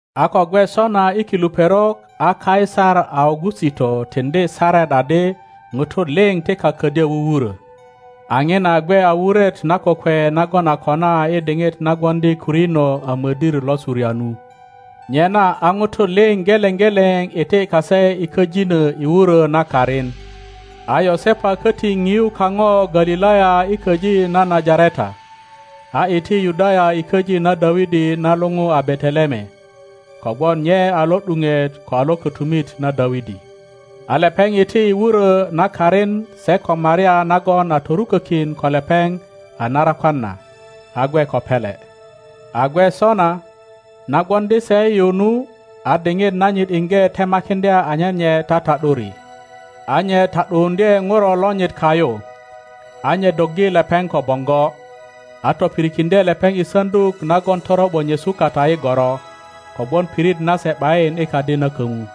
A ko gwe sona i kilu perok a Kaisar Augusito tiŋdi saret adi ŋutu liŋ ti kak ködyö wuwuro. A ŋina gwe a wuret na kokwe nagon a kona i diŋit na gwoŋdi Kwirino a modir lo Suria nu. Nyena a ŋutu liŋ geleŋ geleŋ iti kase i köjino i wuro na karin. A Yosepa koti piu kaŋo Galilaya i köji na Najareta, a iti Yudaya i köji na Dawidi na luŋu a Beteleme, kogwon nye a lo ’duŋet ko a lo kotumit na Dawidi. A lepeŋ ’ti i wuro na karin se ko Maria nagon a torukökin ko lepeŋ a narakwan na, a gwe ko pele. A gwe sona, na gwoŋdi se yu nu, a diŋit nanyit iŋge temakiŋdya anyen nye tata ’duri. A nye ta ’duuŋdye ŋuro lonyit kayu, a nye doggi lepeŋ ko boŋgo, a topirikiŋdye lepeŋ i saŋduk nagon toro ’bo nyesu kata i goro, kogwon pirit nase ’bayin i kadi na komu.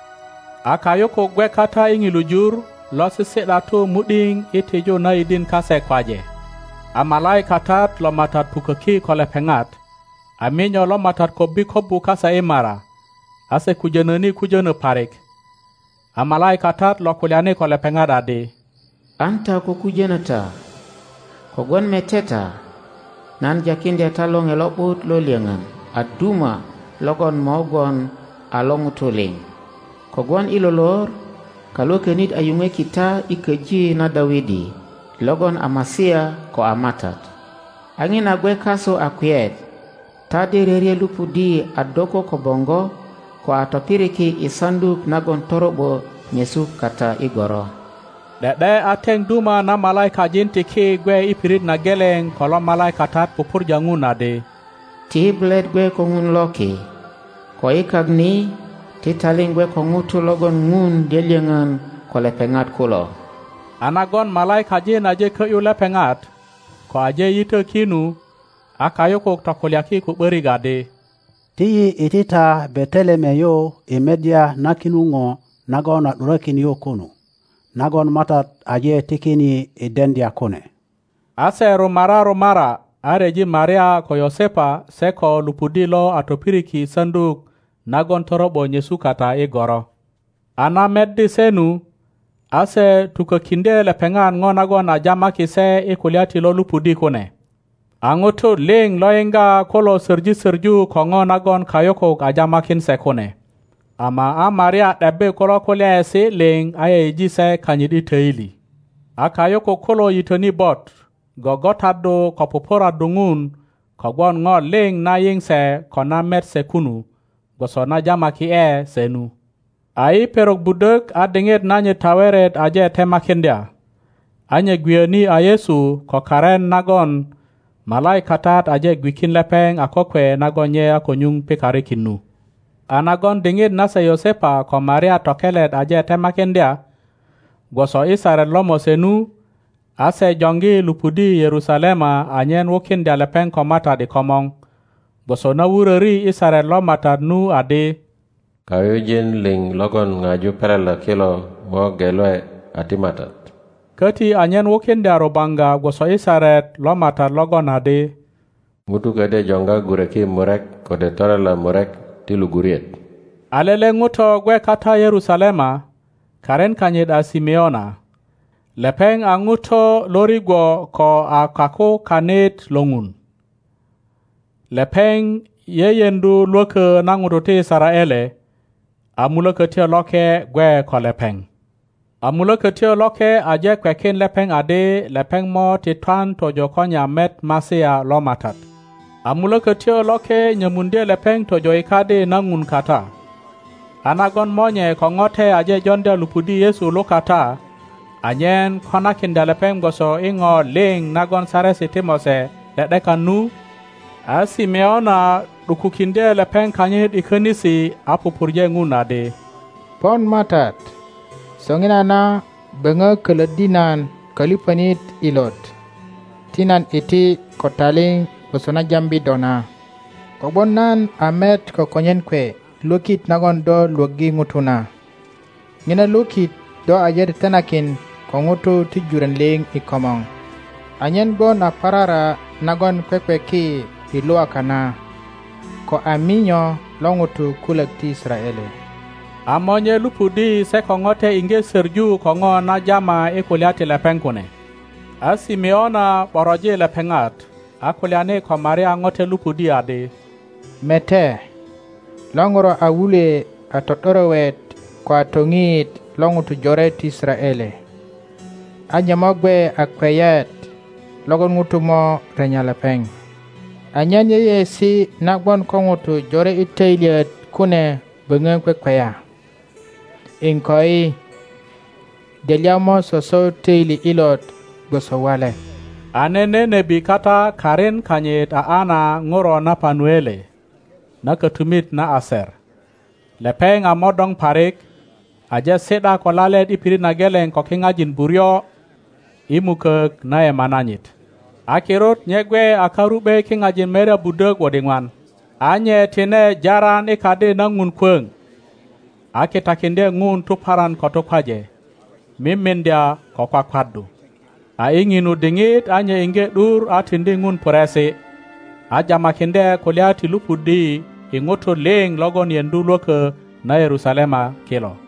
A kayukuk gwe kata i ŋilu jur, lo sisi ’datu mu ’dio i tiju na yidin kase kwaje. A malaikatat lo MATAT puköki ko lepeŋat, a minyo lo MATAT kobbi kobbu kase i mara, a se kujono ni kujönö parik. A malaikatat lo kulyani ko lepeŋat adi, An ta ko kujono ta, kogwon mete ta, nan jakiŋdya ta lore lo ’but lo lyoŋon a duma logon mo gwon a lo ŋutu liŋ; kogwon i lo lor Kalwökönit a yuŋweki ta i köji na Dawidi logon a Masia ko a MATAT. A ŋina gwe kasu a kweyet: ta de ryöryö lupudi a doko ko boŋgo, ko a topiriki i saŋduk nagon toro ’bo nyesu kata i goro. ’De ’de a teŋ duma na malaikajin ti ki gwe i pirit na geleŋ ko lo malaikatat pupurja ŋun adi, Ti bulet gwe ko Ŋun lo ki, ko i kak ni ti taliŋ gwe ko ŋutu logon Ŋun lyölyoŋön ko lepeŋat kulo. A nagon malaikajin aje kö ’yu lepeŋat, ko aje yitö ki nu, a kayukuk tokulyaki ko ’börik adi, Ti yi iti ta Beteleme yu i meddya na kinu ŋo nagon a ’durökin yu kunu, nagon MATAT aje tikin yi i deŋdya kune. A se rumara rumara, a ryeji Maria ko Yosepa se ko lupudi lo a topiriki i saŋduk nagon toro ’bo nyesu kata i goro. A na meddi se nu, a se tukokiŋdye lepeŋat ŋo nagon a jamaki se i kulya ti lo lupudi kune. A ŋutu liŋ lo yiŋga kulo soŋi söŋu ko ŋo nagon kayukuk a jamakin se kune, ama a Maria ’debbi kulo kulyaesi liŋ a yeyeji se kanyit i toili. A kayukuk kulo yitöni bot, gŋgotaddu ko pupuraddu Ŋun kogwon ŋo liŋ na yiŋ se ko na met se kunu, gwoso na jamaki ’e se nu. A i perok budok a diŋit nanyit taweret aje temakiŋdya, a nye gwiyöni a Yesu ko karin nagon malaikatat aje gwikin lepeŋ a kokwe nagon nye a ko nyuŋ pikarikin nu. A nagon diŋit nase Yosepa ko Maria tokelet aje temakiŋdya, gwoso i Saret lo Mose nu, a se joŋgi lupudi Yerusalema anyen wukiŋdya lepeŋ ko MATAT i komor, (gwoso na wuröri i Saret lo MATAT nu adi, Kayujin liŋ logon ŋaju pelela kilo mo gelwe a ti MATAT), koti anyen wukiŋdya rubaŋga gwoso i Saret lo MATAT logon adi, ŋuto ködyö joŋga gureki murek kode torela murek ti luguriet. A lele ŋuto gwe kata Yerusalema, karin kanyit a Simeona. Lepeŋ a ŋuto lorigwo ko a kakukanit lo Ŋun. Lepeŋ yeyeŋdu lwökö na ŋutu ti Yisaraele, a Mulökötyo Loke gwe ko lepeŋ. a Mulökötyo Loke aje kwekin lepeŋ adi lepeŋ mo ti twan tojo ko nye a met Masia lo MATAT. a Mulökötyo Loke nyomuŋdye lepeŋ tojo i Kadi na Ŋun kata; a nagon monye ko ŋote aje joŋdya lupudi Yesu lukata anyen konakiŋdya lepeŋ gwoso i ŋo liŋ nagon Saresi ti Mose ’de ’dekan nu, a Simeona ’dukukiŋdye lepeŋ kanyit i könisi a pupurje Ŋun adi, Pon MATAT, soŋinana böŋö kölöt di nan kölipönit ilot, ti nan iti ko taliŋ gwoso na jambi do na, kogwon nan a met ko konyen kwe lwökit nagon do lwöggi ŋutu na. Ŋina lwökt do aje tetenakin ko ŋutu ti juron liŋ i komor; anyen gwon a parara nagon kwekweki i Lwaka na, ko a minyo lo ŋutu kulok ti Yisaraele. A monye lupudi se ko ŋote iŋge soŋu ko ŋo na jama i kulya ti lepeŋ kune. A Simeona ’boroji lepeŋat, a kulyani ko Maria ŋote lupudi adi, Mete, lo ŋuro a wulwe a to ’dorowet ko a toŋiyit lo ŋutu jore ti Yisaraele, a nye mo gwe a kweyet logon ŋutu mo renya lepeŋ, anyen yeyeesi na gwon ko ŋutu jore i töilyet kune böŋö kwekweya. Iŋkoi, delya mo soso töili ilot gwoso wale. A nene nebi kata karin kanyit a Ana ŋuro na Panuele, na kötumit na Aser. Lepeŋ a modoŋ parik, aje si ’da ko lalet i pirit na geleŋ ko kiŋajin buryo i mukok na yema nanyit, a kirut nye gwe a karu ’be kiŋajin merya budök wot iŋwan. A nye tine jaran i kadi na Ŋun kwöŋ, a kitakiŋdye ŋun tuparan ko tukwaje, mimiŋdya ko kwakwaddu. A i ŋinu diŋit a nye iŋge ’dur a tiŋdi Ŋun puresi, a jamakiŋdye kulya ti lupudi i ŋutu liŋ logon yeŋdu lwökö na Yerusalema kilo.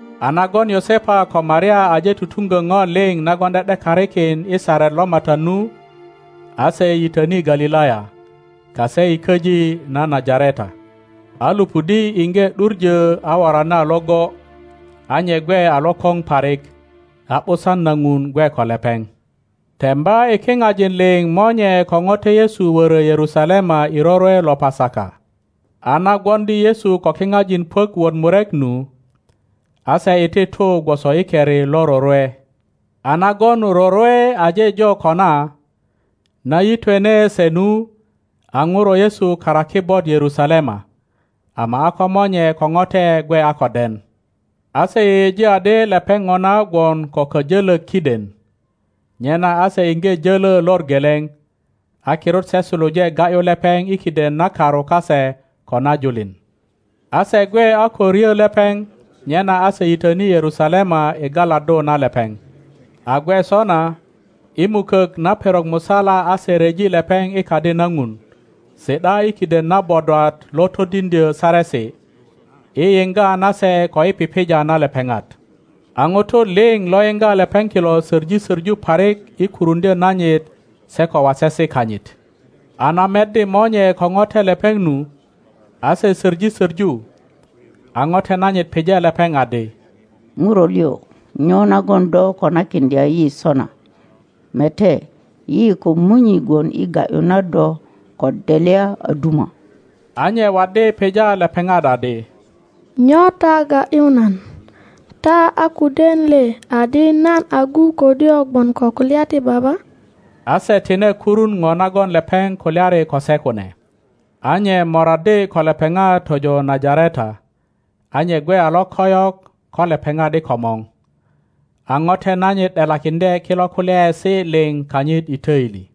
A nagon Yosepa ko Maria aje tutuŋgö ŋo liŋ nagon ’de ’dekarikin i Saret lo MATAT nu, a se yitöni Galilaya, kase i köji na Najareta. A lupudi iŋge ’duŋö a worani a iŋgo, a nye gwe a lokoŋ parik, a ’busan na Ŋun gwe ko lepeŋ. Temba i kiŋajin liŋ monye ko ŋote Yesu wörö Yerusalema i rorwe lo Pasaka. A na gwoŋdi Yesu ko kiŋajin puök wot murek nu, a se iti tu gwoso i keri lo rorwe. a nagon rorwe aje jo kona, na yitwene se nu, a ŋuro Yesu karaki bot Yerusalema, ama a ko monye ko ŋote gwe a ko den. a se yeyeji adi lepeŋ ŋona gwon ko kajölök kiden, nyena a se iŋge jolo lor geleŋ, a kirut se suluje ga ’yu lepeŋ i kiden na karu kase ko na julin. a se gwe a ko ryö lepeŋ, nyena a se yitöni Yerusalema i galaddu na lepeŋ. A gwe sona, i mukök na perok musala a se ryeji lepeŋ i kadi na ŋun, si ’da i kiden na bodwat lo todiŋdyö saresi, i yiŋga na se ko i pipija na lepeŋat. a ŋutu liŋ lo yiŋga lepeŋ kilo söŋi söŋu parik i kuruŋdyö nanyit se ko wasesi kanyit. a na meddi monye ko ŋote lepeŋ nu, a se söŋi söŋu, a ŋote nanyit pije lepeŋ adi, ŋuro liŋ, nyo nagon do konakiŋdya yi sona? Mete, yi ko munyi gwon i ga ’yu na do ko delya a duma. a nye waddi pija lepeŋat adi, Nyo ta ga ’yu nan? Ta a ko den le adi nan agu ködyö gwon ko kulya ti Baba? A se tine kurun ŋo nagon lepeŋ kulyari ko se kune. A nye moraddi ko lepeŋat tojo Najareta, a nye gwe a lokoyok ko lepeŋat i komor. A ŋote nanyit ’delakiŋdye kilo kulyaesi liŋ kanyit i toili.